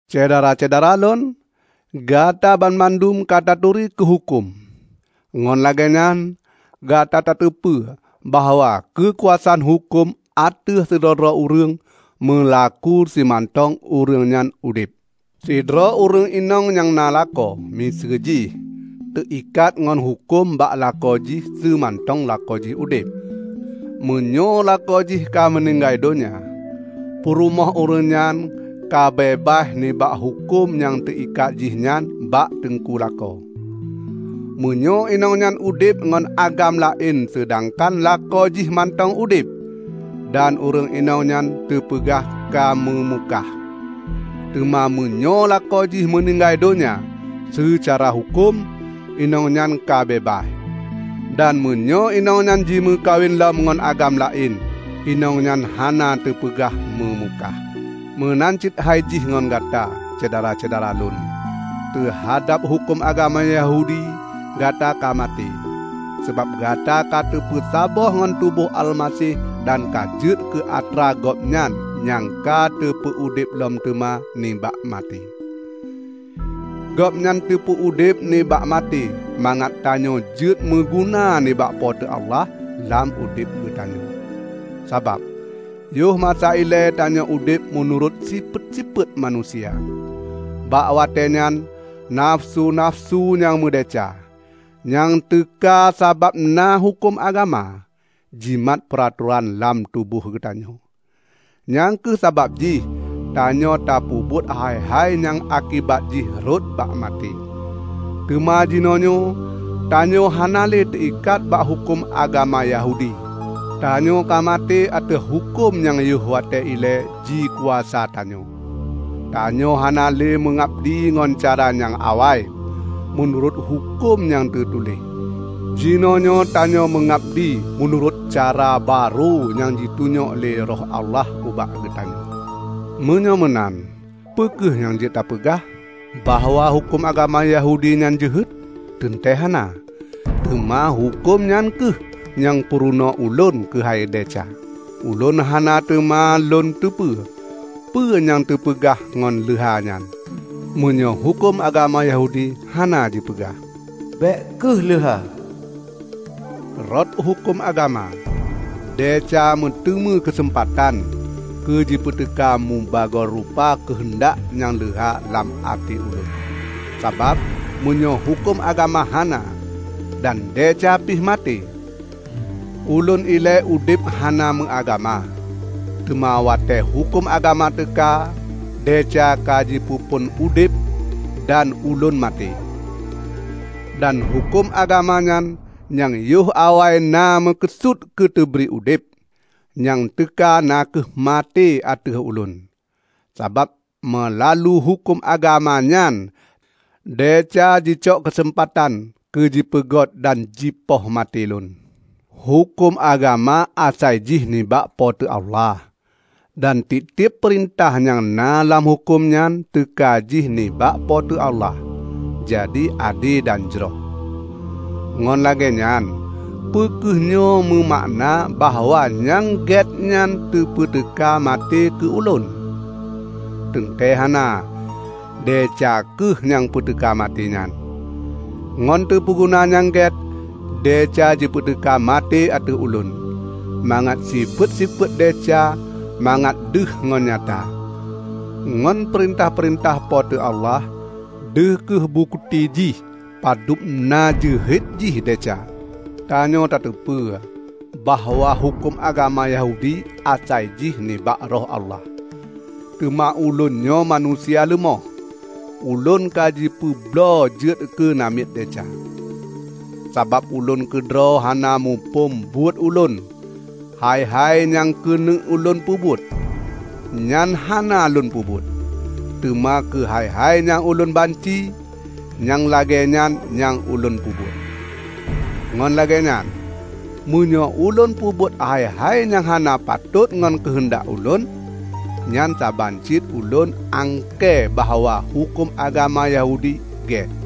Syedara-syedara lôn! Gata banmandum ka taturi keu huköm. Ngon lagée nyan, gata tateupeue bahwa keukuasaan huköm ateueh sidroe-droe ureuëng, meulaku simantong ureuëng nyan udeb. Sidroe ureuëng inong nyang na lakoe, miseue jih, teuikat ngon huköm bak lakoe jih seumantong lakoe jih udeb. Meunyoe lakoe jih ka meuninggai donya, peurumoh ureuëng nyan ka beubaih nibak huköm nyang teuikat jihnyan bak teungku lakoe. Meunyoe inong nyan udeb ngon agam laén seudangkan lakoe jih mantong udeb, dan ureuëng inong nyan teupeugah ka meumukah. Teuma meunyoe lakoe jih meuninggai donya, seucara huköm, inong nyan ka beubaih. Dan meunyoe inong nyan jimeukawen lom ngon agam laén, inong nyan hana teupeugah meumukah. Meunan cit hai jih ngon gata, Syedara-syedara lôn. Teuhadab huköm agama Yahudi gata ka maté, sabab gata ka teupeusaboh ngon tuboh Almaseh dan ka jeuet keu atra Gobnyan nyang ka teupeu udeb lom teuma nibak maté. Gobnyan teupeu-udeb nibak maté mangat tanyoe jeuet meuguna nibak Po teu Allah, lam udeb geutanyoe. Sabab, yoh masa ilée tanyoe udeb meunurot sifeuet-sifeuet manusia. Bak watée nyan nafeusu-nafeusu nyang meudesya, nyang teuka sabab na huköm agama, jimat peuranan lam tuboh geutanyoe. Nyang kheueh sabab jih tanyoe tapeubuet hai-hai nyang akibat jih rhot bak maté. Teuma jinoenyoe tanyoe hana le teuikat bak huköm agama Yahudi. Tanyoe ka maté ateueh huköm nyang yoh watée ilée jikuasa tanyoe. Tanyoe hana le meungabdi ngon cara nyang awai, meunurot huköm nyang teutuléh. Jinoenyoe tanyoe meungabdi meunurot cara barô nyang jitunyok lé Roh Allah ubak geutanyoe. Meunyoe meunan, peu kheueh nyang jeuet tapeugah? Bahwa huköm agama Yahudi nyan jeuhet? Teuntée hana! Teuma huköm nyan kheueh nyang purunoe ulôn keuhai desya. Ulôn hana teuma lôn teupeu peue nyang teupeugah ngon leuha nyan, meunyoe huköm agama Yahudi hana jipeugah, "Bék kheueh leuha." Rot huköm agama, desya meuteumé keuseumpatan keu jipeuteuka mubagoe rupa keuheundak nyang leuha lam até ulôn; sabab meunyoe huköm agama hana, dan desya pih maté. Ulôn ilée udeb hana meuagama. Teuma watée huköm agama teuka, desya ka jipeuphon udeb dan ulôn maté. Dan huköm agama nyan, nyang yoh awai na meukeusut keu teubri udeb, nyang teuka na kheueh maté ateueh ulôn. Sabab meulalu huköm agama nyan, desya jicok keuseumpatan keu jipeunget dan jipoh maté lôn. Huköm agama asai jih nibak Po teu Allah, dan tieb-tieb peurintah nyang na lam huköm nyan teuka jih nibak Po teu Allah, jadi ade dan jroh. Ngon lagée nyan, peu kheueh nyoe meumakna bahwa nyang gét nyan jipeuteuka maté keu ulôn? Teuntée hana! Desya kheueh nyang peuteuka maté nyan. Ngon teupeuguna nyang gét, desya jipeuteuka maté ateueh ulôn, mangat sifeuet-sifeuet desya mangat deuh ngon nyata. Ngon peurintah-peurintah Po teu Allah, deuh kheueh bukeuti jih padub na jeuhet jih desya. Tanyoe tateupeue bahwa huköm agama Yahudi asai jih nibak Roh Allah; teuma ulôn nyoe manusia leumoh. Ulôn ka jipeubloe jeuet keu namiet desya. Sabab ulôn keudroe hana muphom buet ulôn. Hai-hai nyang keuneuk ulôn peubuet, nyan hana lôn peubuet; teuma keu hai-hai nyang ulôn banci, nyang lagée nyan nyang ulôn peubuet. Ngon lagée nyan, meunyoe ulôn peubuet hai-hai nyang hana patot ngon keuheundak ulôn, nyan saban cit ulôn angkée bahwa huköm agama Yahudi gét.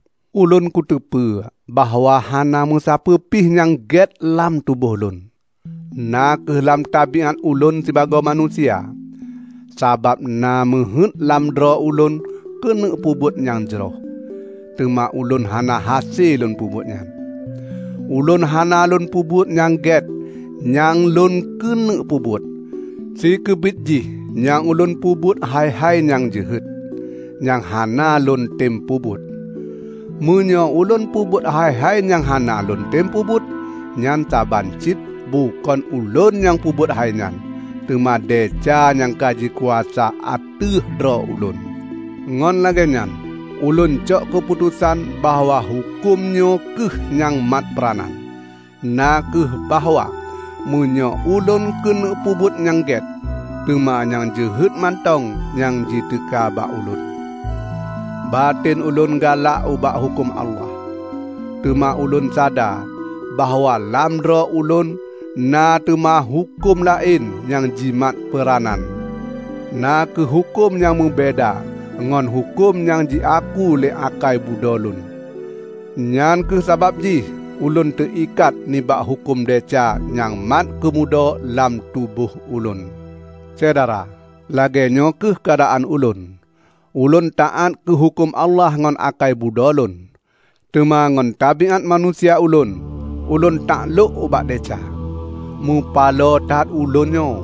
Ulôn kuteupeue bahwa hana meusapeue pih nyang gét lam tuboh ulôn; na kheueh lam tabiát ulôn sibagoe manusia. Sabab na meuheuét lam droe ulôn keuneuk peubuet nyang jroh, teuma ulôn hana hase lôn peubuet nyan. Ulôn hana lôn peubuet nyang gét nyang lôn keuneuk peubuet; sikeubit jih nyang ulôn peubuet hai-hai nyang jeuhet, nyang hana lôntem peubuet. Meunyoe ulôn peubuet hai-hai nyang hana lôn tem peubuet, nyan saban cit bukon ulôn nyang peubuet hai nyan, teuma desya nyang ka jikuasa ateueh droe ulôn. Ngon lagée nyan ulôn cok keuputosan bahwa huköm nyoe kheueh nyang mat peuranan: na kheueh bahwa meunyoe ulôn keuneuk peubuet nyang gét, teuma nyang jeuhet mantong nyang jiteuka bak ulôn. Baten ulôn galak ubak huköm Allah, teuma ulôn sadar bahwa lam droe ulôn na teuma huköm laén nyang jimat peuranan -- na kheueh huköm nyang meubeda ngon huköm nyang jiaku lé akai budho lôn. Nyang kheueh sabab jih ulôn teuikat nibak huköm desya nyang mat keumudo lam tuboh ulôn. Syedara, lagée nyoe kheueh keuadaan ulôn: ulôn taát keu huköm Allah ngon akai budho lôn, teuma ngon tabiát manusia ulôn, ulôn taklôk ubak desya. Mupaloe that ulôn nyoe!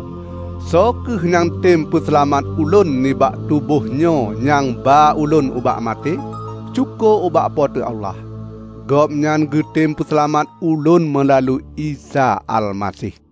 Soe kheueh nyang tem peuseulamat ulôn nibak tuboh nyoe nyang ba ulôn ubak maté? Syukoe ubak Po teu Allah! Gobnyan geutem peuseulamat ulôn meulalu Isa Almaseh.